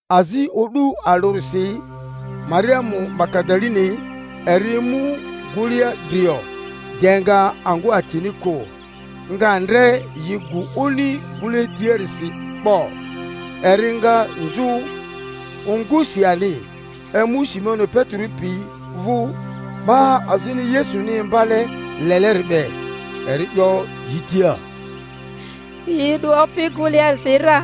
Azio'du alᴜrisi Mariamu Magadaleni eri emu gᴜlea drio, de nga angᴜ atini kᴜ, nga ndre yi gᴜ oni gᴜle tiarisi 'bo. Eri nga nzᴜ ongusi ani, emu Simoni Petero pi vᴜ, 'ba azini Yesuni imbale leleri be, eri 'yo yi tia, Yi 'du Opini gᴜlearisi ra,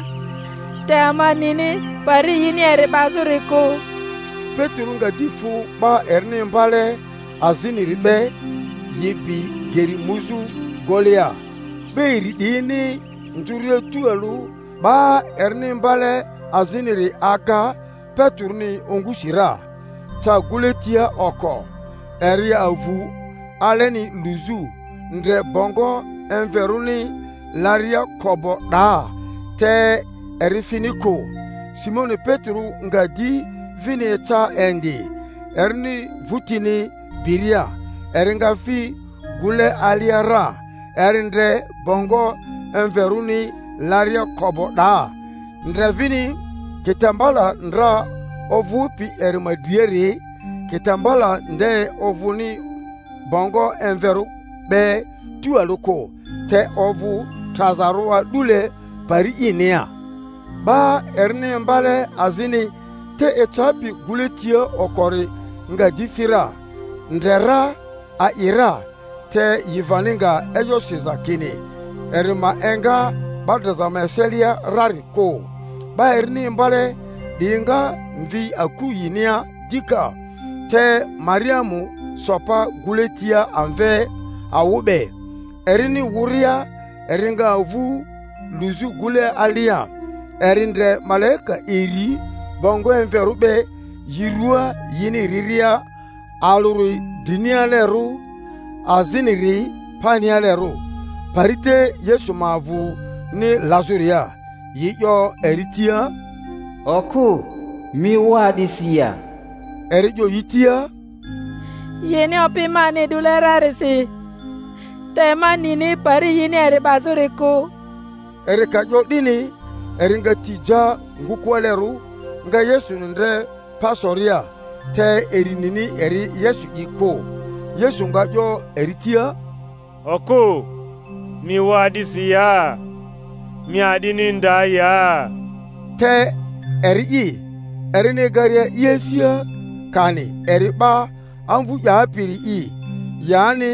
te ama nini pari yini eri 'bazᴜri kᴜ. Petero nga di fᴜ 'ba erini imbale aziniri be, yi bi geri muzᴜ gulea. 'Ba iri 'diyini nzᴜria tualᴜ, 'ba erini imbale aziniri aga Peteroni ongusi ra, ca gᴜle tia oko; eri avu aleni luzᴜ, ndre bongo emverᴜni laria ko'bo 'daa, te eri fini kᴜ. Simoni Petero nga di vini eca indi, erini votini biria, eri nga fi gᴜle alia ra; eri ndre bongo emverᴜni laria ko'bo 'daa, ndre vini kitambala ndra ovᴜpi eri ma driari, kitambala nde ovᴜni bongo emverᴜ be tualᴜ kᴜ, te ovᴜ trazarᴜ a'dule pari inia. 'Ba erini imbale azini te ecapi gᴜle tia okori nga di fi ra, ndre ra, a'i ra. Te yi vani nga e'yo siza kini eri ma enga 'ba draza ma eselia rari kᴜ. 'Ba erini imbale 'diyi nga mvi aku yinia dika. Te Mariamu so pa gᴜle tia amve awᴜ be, erini wᴜria, eri nga avu luzᴜ gᴜle alia; eri ndre malaika iri bongo emverᴜ be yi ruaa yini riria, alᴜri drinialerᴜ, aziniri panialerᴜ, pari te Yesu ma avᴜni lazᴜria. Yi 'yo eri tia, Okᴜ, mi wᴜ a'disi ya? Eri 'yo yi tia, Yini Opi mani 'dule rarisi, te ma nini pari yini eri 'bazᴜri kᴜ. Eri ka 'yo 'dini, eri nga ti ja ngᴜkᴜalerᴜ, nga Yesuni ndre pa soria, te eri nini eri Yesu'i kᴜ. Yesu nga 'yo eri tia, Okᴜ, mi wᴜ a'disi ya? Mi a'dini nda ya? Te eri'i, erini egaria i asia kani eri 'ba amvu 'yapiri'i yani,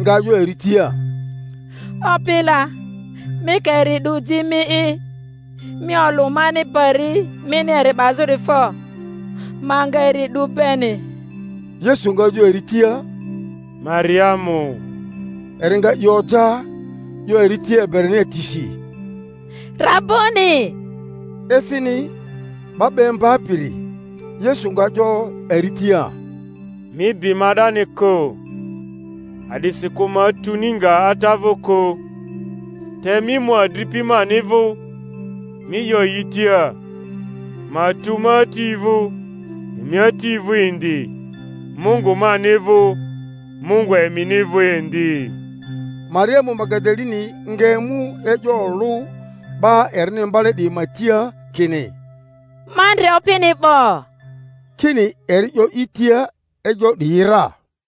nga 'yo eri tia, Opi la, mi ka eri 'du ji mi'i, mi olᴜ mani pari mini eri 'bazᴜri fo, ma nga eri 'du beni. Yesu nga 'yo eri tia, Mariamu. Eri nga i oja, 'yo eri tia Ebrania tisi, Raboni! (efini, 'Ba 'ba Imbapiri). Yesu nga 'yo eri tia, Mi bi ma 'dani kᴜ, a'disikᴜ ma tuni nga Ata vᴜ kᴜ; te mi mu adripi mani vᴜ, mi 'yo yi tia, ma tu ma Ati vᴜ, emi Ati vᴜ indi, Mungu mani vᴜ, Mungu emini vᴜ indi. Mariamu Magadaleni nga emu e'yo olᴜ 'ba erini imbale 'diyi ma tia kini, Ma ndre Opini 'bo; kini eri 'yo i tia e'yo 'diyi ra.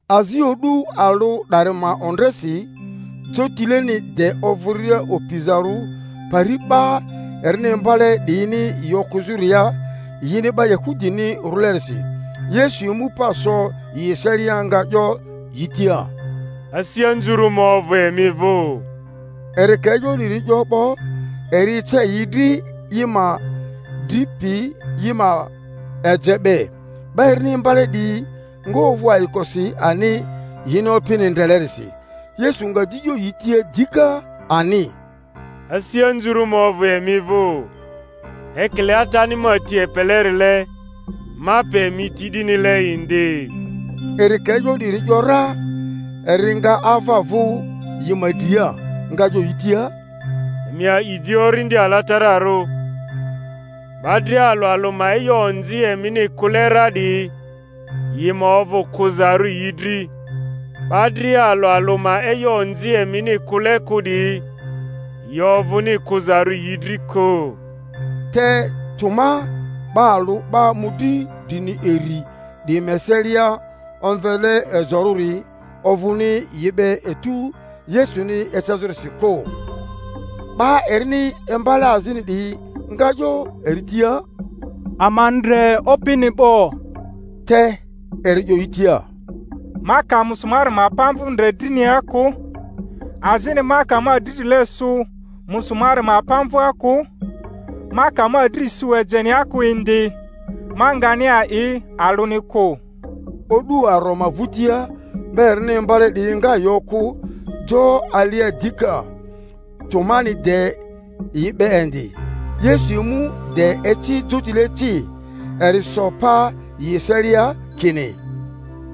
Azio'du alᴜ 'dari ma ondresi, jotileni de ovᴜria opizarᴜ pari 'ba erini imbale 'diyini yi okᴜzᴜria yini 'ba Yahudini rᴜlerisi, Yesu emu pa so yi eselia, nga 'yo yi tia, Asi anzurᴜ ma ovᴜ emi vᴜ. Eri ka e'yo 'diri 'yo 'bo, eri ece yi dri i ma dri piyi i ma eje be. 'Ba erini imbale 'diyi nga ovᴜ ayikosi ani yini Opini ndrelerisi. Yesu nga di 'yo yi tia dika ani, Asi anzurᴜ ma ovᴜ emi vᴜ. Ekile Atani ma ti epelerile, ma pe emi ti 'dinile indi. Eri ka e'yo 'diri ‘yora, eri nga ava vᴜ yi ma dria, nga 'yo yi tia, Emi a'i di Orindi Alatararᴜ. 'Ba dria alᴜ alᴜ ma e'yo onzi emini kᴜle ra 'diyi, yi ma ovᴜ kᴜzarᴜ yi dri; 'ba dria alᴜ alᴜ ma e'yo onzi emini kᴜle kᴜ 'diyi, yi ovᴜni kᴜzarᴜ yi dri kᴜ. Te Toma, 'ba alᴜ 'ba mᴜdri drini iri 'diyi ma eselia omvele Ejorᴜri, ovᴜni yi be etu Yesuni ecazᴜrisi kᴜ. 'Ba erini imbale azini 'diyi nga 'yo eri tia, Ama ndre Opini 'bo. Te eri 'yo yi tia, Ma ka musumari ma pamvᴜ ndre drinia kᴜ, azini ma ka ma dridrile sᴜ musumari ma pamvᴜa kᴜ, ma ka ma dri sᴜ ejenia kᴜ indi, ma ngani a'i alᴜni kᴜ. O'du aro ma vᴜtia, 'ba erini imbale 'diyi nga yi okᴜ jo alia dika, Tomani de yi be indi. Yesu emu de eci jotile ci, eri so pa yi eselia, kini,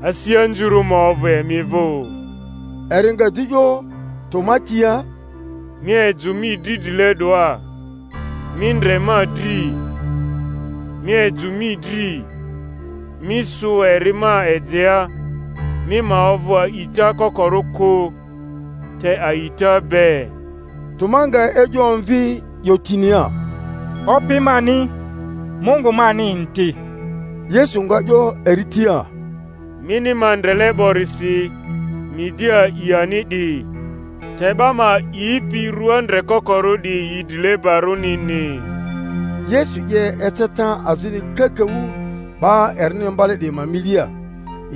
Asi anzurᴜ ma ovᴜ emi vᴜ. Eri nga di 'yo Toma tia, Mi ejᴜ mi dridrile 'doa, mi ndre ma dri; mi ejᴜ mi dri, mi sᴜ eri ma ejea; mi ma ovᴜ a'ita kokorᴜ kᴜ, te a'ita be. Toma nga e'yo omvi 'yo tinia, Opi mani, Mungu mani indi! Yesu nga 'yo eri tia, Mini ma ndrele 'borisi mi di a'i ani 'di; te 'ba ma a'ipi rua ndrekokorᴜ 'diyi yi drilebarᴜnini. Yesu 'ye eceta azini kakaᴜ 'ba erini imbale 'diyi ma milia,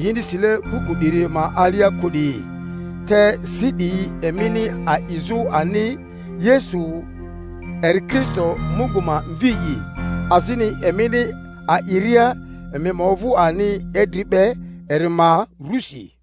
yini sile buku 'diri ma alia kᴜ 'diyi; te si 'diyi emini a'izᴜ ani Yesu eri Kristo Mungu ma Mvi'i, azini emini a'iria emi ma ovᴜ ani idri be eri ma rusi.